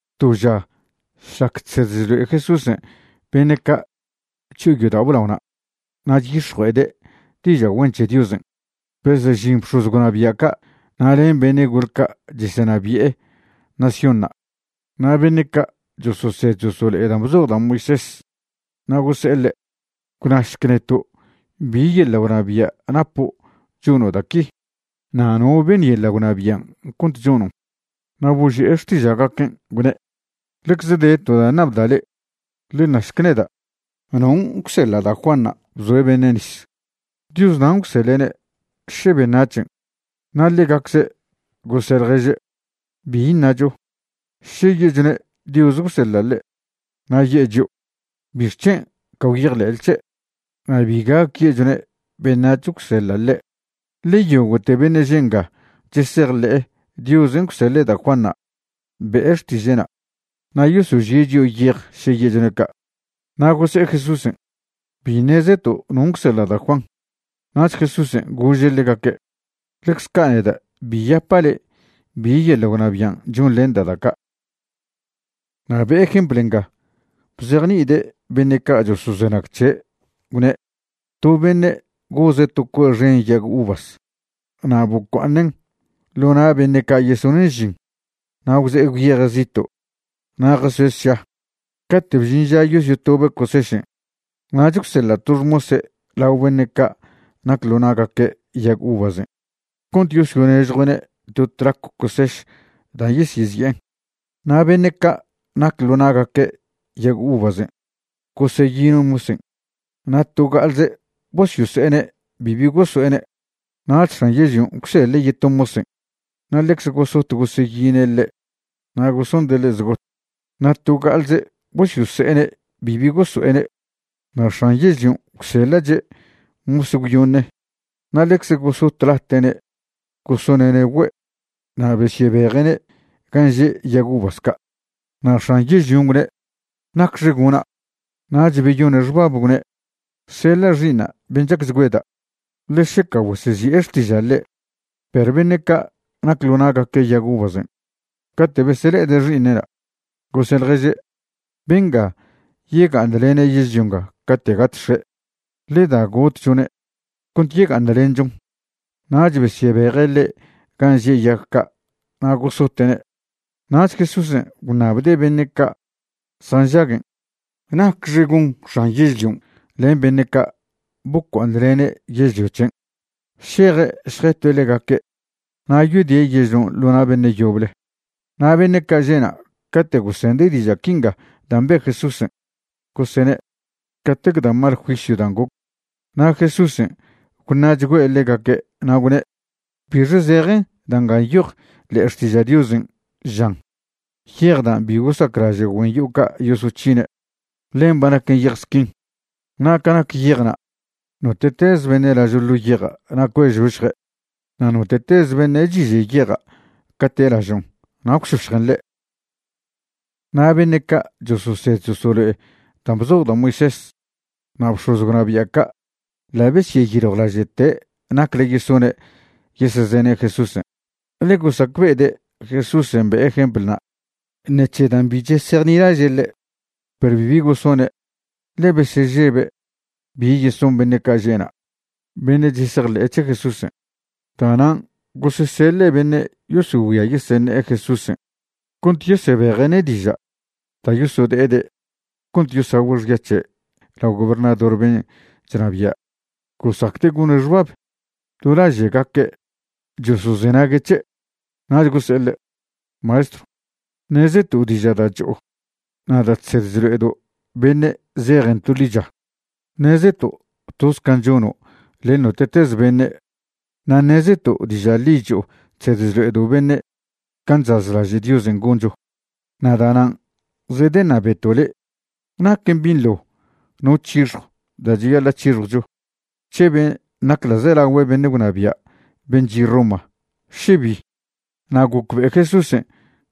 To ža šlac chsed chlo'e Jesúsen' beṉe' ca' chyo'o yodao' blaona' na' chyix̱jue'ede' diža' güen c̱he Diosen', besežin bx̱oz gwnabia' ca' na' len beṉe' gol ca' chesenabi'e naciónṉa' na' beṉe' ca' chososed chosolo'e dan' bzoj da' Moisés. Na' gose'e ḻe': ―Gwnašc neto' bi yeḻa' gwnabia' napo' chono' da' qui, na' no beṉ yeḻa' gwnabian' cont chonon'. Na' boži'e xtiža'gaquen', gwne': ―Ḻecze de to da' ṉabda' le'e. Ḻe našc neda' ¿non' gwseḻa' da' Juanṉa' bzoe' beṉe' nis? ¿Dios nan' gwseḻe'ne', še beṉac̱hen'? Na' ḻegacze' gose' ḻježe': ―¿Bi ṉacho? Še ye'chone' Dios gwseḻa' ḻe', na' ye'e chio': “¿Bixc̱hen' ca gwyejḻe'le c̱he'?” Na' bi gac ye'chone' beṉac̱h gwseḻa' ḻe', ḻe yogo'te beṉe' že' nga chesejḻe'e Diosen' gwseḻe' da' Juanṉa' be'e xtiže'na', na' yosožie' chio' yej še ye'chone' ca'. Na' gose'e Jesúsen': ―Bi ṉezeto' non' gwseḻa' da' Juan. Nach Jesúsen' gože' ḻegaque': ―Ḻecz ca' neda' bi yapa' le'e bi yeḻa' gwnabian' chonḻenda' da' ca'. Na' be'e jempl nga bzejni'ide' beṉe' ca' chosozenag c̱he', gwne': ―To beṉe' goze' to cue' xen yag uvas na' bocua'aṉen' ḻo na' beṉe' ca' yesonen' žin na' gwze'e gwyeje' zito' na' jasoe' sša. Cate' bžin ža yosyotobe' cosešen', nach gwseḻa' to xmose' lao beṉe' ca' nac ḻo na'gaque' yag uvasen' cont yosyonežjue'ne' to tlacw coseš dan' yesyezi'en. Na' beṉe' ca' nac ḻo na'gaque' yag uvasen' goseyine' mosen' na' to ga'alze bosyose'ene' bibi goso'ene'. Nach x̱an yežlion' gwseḻe' yeto mosen', na' ḻecze gosot goseyine' ḻe' na' gosonde' ḻe' zgot, na' to ga'alze bosyose'ene' bibi goso'ene'. Na' x̱an yežlion' gwseḻa'che' mos gwyoṉe, na' ḻecze gosotlate'ne' gosone'ne' güe', na' besyebeje'ne' gan' že' yag uvas ca'. ’Na' x̱an yežlion' gwne': “¿Nacxe gona'?” Nach beyone' xbab gwne': “Seḻa' xi'iṉa' ben' chacchgüeda', ḻe šeca güesezi'e xtiža' ḻe'.” Perw beṉe' ca' nac ḻo na'gaque' yag uvasen' cate' besele'ede' xi'iṉe'na', gose' ḻježe': “Benga yega'aṉlene' yežlio nga cate' gat x̱e'. Ḻe da gotchone' cont yega'aṉlenchon.” Nach besyebeje' ḻe' gan' že' yag ca' na' gosote'ne'. Nach Jesúsen' gwṉabde' beṉe' ca' zjanžaguen': ―¿Nacxe gon x̱an yežlion' len beṉe' ca' bocua'aṉlene' yežlio c̱hen'? Šeje' šjetue' ḻegaque' na' yodie' yežlion' ḻo na' beṉe' yoble. Na' beṉe' ca' že'na' cate' gosende' diža' quinga dan' be' Jesúsen' gosene': ―¡Catec da' mal juisyw dan' goc! Na' Jesúsen' gwṉa'chgüe' ḻegaque' na' gwne': ―¿Bixe zejen da' nga nyojen ḻe'e Xtiža' Diosen'? žan: Yej dan' bi gosaclaže' güen yo'o ca' yosoc̱hine', ḻen ba naquen yej squin. Na' ca nac yejna', note'tez beṉe' lažo' ḻo yeja' na' cue'žošje', na' note'tez beṉe' chiže' yeja' cate' lažon' na' gwšošjen ḻe'. Na' beṉe' ca' chososed chosolo'e dan' bzoj da' Moisés na' bx̱oz gwnabia' ca' ḻa' besyeyiljwlaže'te nacle yesone' yesezene' Jesúsen', ḻe gosacbe'ede' Jesúsen' be'e jemplna' ṉec̱he dan' bi chesejnilaže' ḻe'. Perw bibi gosone', ḻe besežebe' bi yeson beṉe' ca' že'na' beṉe' chesejḻe'e c̱he Jesúsen'. Da'nan' goseseḻe' beṉe' yosogüia yeseṉe'e Jesúsen' cont yesebeje'ne' diža' da' yosode'ede' cont yesagüe' xya c̱he' lao gobernador ben' chnabia'. Gosacde' gone' xbab do laže'gaque' chosozenague' c̱he'. Nach gose'e ḻe': ―Maestrw, ṉezeto' diža' da' cho'o na' da' chsed chlo'edo' beṉe' zejen to ḻicha. Ṉezeto' toz can' chono' len note'tez beṉe'. Na' ṉezeto' diža' ḻi cho'o chsed chlo'edo' beṉe' can' chazlaže' Diosen' goncho. Na' da'nan' zedeṉabeto' le' ¿naquen binḻo no c̱hixjo da' cheyaḻa' c̱hixjwcho c̱he ben' nac ḻa'zelagüe beṉe' gwnabia' ben' chi' Roma, še bi? Na' gocbe'e Jesúsen'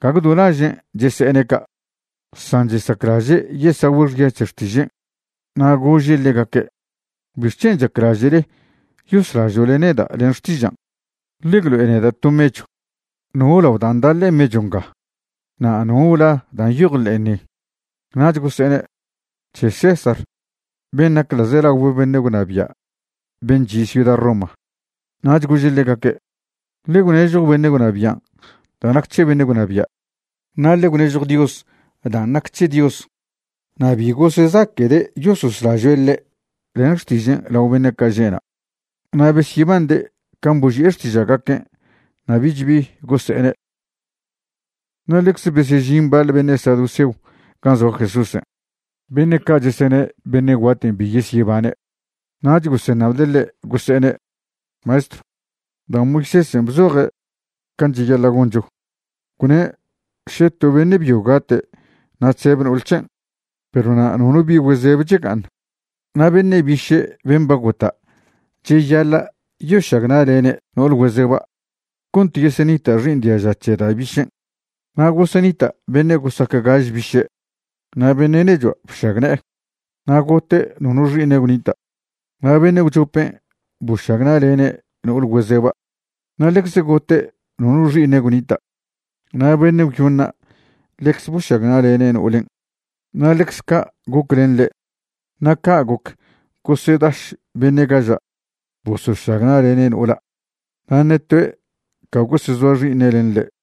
gague do lažen' chese'ene' ca', san chesaclaže' yesagüe' xya c̱he xtižen'. Na' gože' ḻegaque': ―¿Bixc̱hen' chaclaže'le yoslažo'le neda' len xtižan'? Ḻe gwlo'e neda' to mechw. ¿No lao dan' da' ḻe'e mechw nga? na' ¿no la' dan' nyoj ḻe'en ni? Nach gose'ene': ―C̱he César ben' nac ḻa'zelagüe beṉe' gwnabia' ben' chi' ciuda Roma. Nach gože' ḻegaque': ―Ḻe gwnežjo beṉe' gwnabian' da' nac c̱he beṉe' gwnabia', na' ḻe gwnežjo Dios dan' nac c̱he Dios. Na' bi gosezaque'de' yososlažoe' ḻe' len xtižen' lao beṉe' ca' že'na'. Na' besyebande' can' boži'e xtiža'gaquen', na' bich bi gose'ene'. Na' ḻecze besežin baḻ beṉe' saduceo gan' zoa Jesúsen'. Beṉe' ca' chesene' beṉe' guaten' bi yesyebane'. Nach goseṉabde' ḻe', gose'ene': ―Maestrw, da' Moisésen' bzoje' can' cheyaḻa' goncho, gwne' še to beṉe' byo gate' na' chzeb no'ol c̱hen' perw na' nono bi güezeb chga'aṉ, na' beṉe' biše' ben' ba gota' cheyaḻa' yošagna'lene' no'ol güezeba' cont yeseṉita' xi'iṉ diaža c̱he da' bišen'. Na' gosenita' beṉe' gosac gaž biše'. Na' beṉe' nechua' bšagne'e, na' gote' nono xi'iṉe' gwnita'. Na' beṉe' gwchopen' bošagna'lene' no'ol güezeba', na' ḻecze gote' nono xi'iṉe' gwnita'. Na' beṉe' gwyoṉa' ḻecze bošagna'lene' no'olen', na' ḻecz ca' goc len ḻe'. Na' ca' goc gosedaš beṉe' gaža' bosošagna'lene' no'ola', na' ṉe toe' ca gosezoa xi'iṉe' len ḻe'.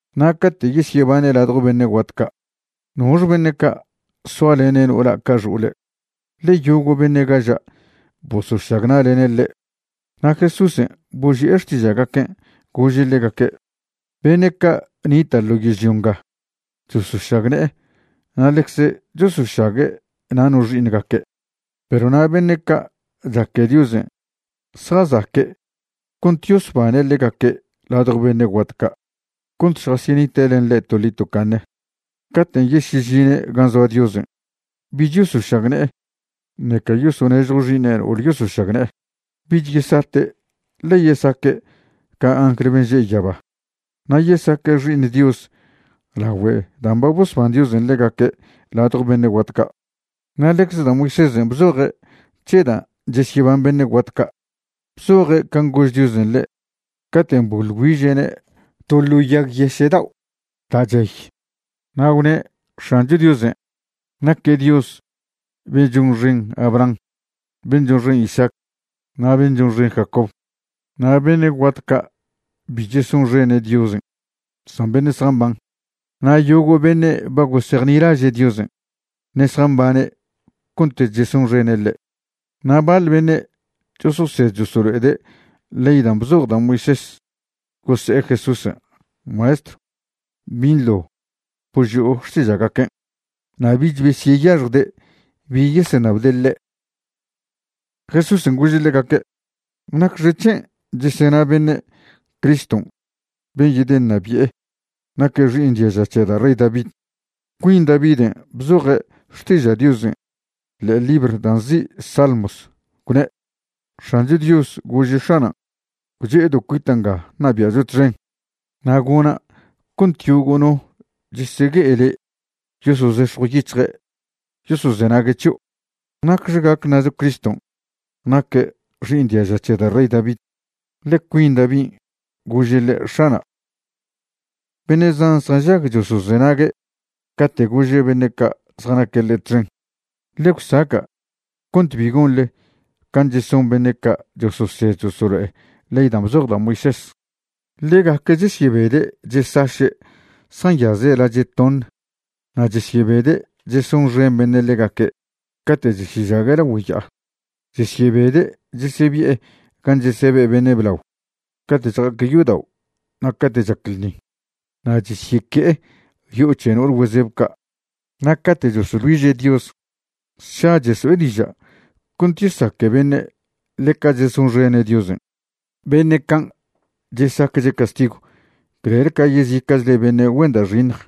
Na' cate' yesyebane' ladjo beṉe' guat ca', ¿nox beṉe' ca' soalene' no'ola' ca xo'ole'?, ḻe yogo' beṉe' gaža' bosošagna'lene' ḻe'. Na' Jesúsen' boži'e xtiža'gaquen', gože' ḻegaque': ―Beṉe' ca' nita' ḻo yežlio nga chosošagne'e na' ḻecze chosošague' na' no xi'iṉgaque'. Perw na' beṉe' ca' chaque Diosen' zjazaque' cont yosbane' ḻegaque' ladjo beṉe' guat ca' cont šjasyenite' len ḻe' toḻi tocaṉe, caten' yesyežine' gan' zoa Diosen' bich yosošagne'e ṉeca yosonežjo xi'iṉe' no'ol yosošagne'e. Bich yesate', ḻe yesaque' ca angl ben' že' yaba, na' yesaque' xi'iṉ Dios lagüe dan' ba bosban Diosen' ḻegaque' ladjo beṉe' guat ca'. Na' ḻecze da' Moisésen' bzoje' c̱he dan' chesyeban beṉe' guat ca'. Bzoje' can' gož Diosen' ḻe' caten' boḻ güiže'ne' to ḻo yag yeše' dao' da' chey. Na' gwne' X̱ancho Diosen' naque' Dios ben' chonxen Abraham, ben' chonxen Isaac, na' ben' chonxen Jacob. Na' beṉe' guat ca' bi chesonxene' Diosen', san beṉe' zjamban. Na' yogo' beṉe' ba gosejnilaže' Diosen', ṉe' zjambane' cont chesonxene' ḻe'. Na' baḻ beṉe' chososed chosolo'ede' ley dan' bzoj da' Moisés gose'e Jesúsen': ―Maestrw, binḻo boži'o xtiža'gaquen'. Na' bich besyeyaxjde' bi yeseṉabde' ḻe'. Jesúsen' gože' ḻegaque': ―¿Nacxec̱hen' chesena beṉe' Criston' ben' yedeṉabi'e naque' xi'iṉ diaža c̱he da' rey David? Cuin Daviden' bzoje' Xtiža' Diosen' ḻe'e libr da' nzi' Salmos, gwne': X̱ancho Dios gože' X̱anan': “Gwche'edo' cuita' nga ṉabia'cho txen, na' gona' cont yogo' no chesegue'e le' yosozex̱jw yic̱hje' yosozengue' c̱hio'.” ¿Nacxe gac ṉacho Criston' naque' xi'iṉ diaža c̱he da' rey David? ḻe cuin Davin' gože' ḻe': “X̱ana'”. Beṉe' zan zjanžag chosozenague' cate' gože' beṉe' ca' zjanaque' ḻe' txen: ―Ḻe gwsaca' cont bi gonḻe can' cheson beṉe' ca' chososed chosolo'e ley dan' bzoj da' Moisés. Ḻegaque' chesyebede' chesaše' zjanyaze' lache' toṉ. Na' chesyebede' chesonxen beṉe' ḻegaque' cate' chesyežague' lagüe ya'a. Chesyebede' chesebi'e gan' chesebe' beṉe' blao cate' chja'aque' yodao' na' cate' chac ḻṉi. Na' chesyeque'e yo'o c̱he no'ole güezeb ca'. Na' cate' chosoḻ güiže' Dios, sša cheso'e diža' cont yesaque beṉe' ḻeca chesonxene' Diosen'. Beṉe' can' chesacche' castigw clel ca yezica'chle beṉe' güen da' xiṉj.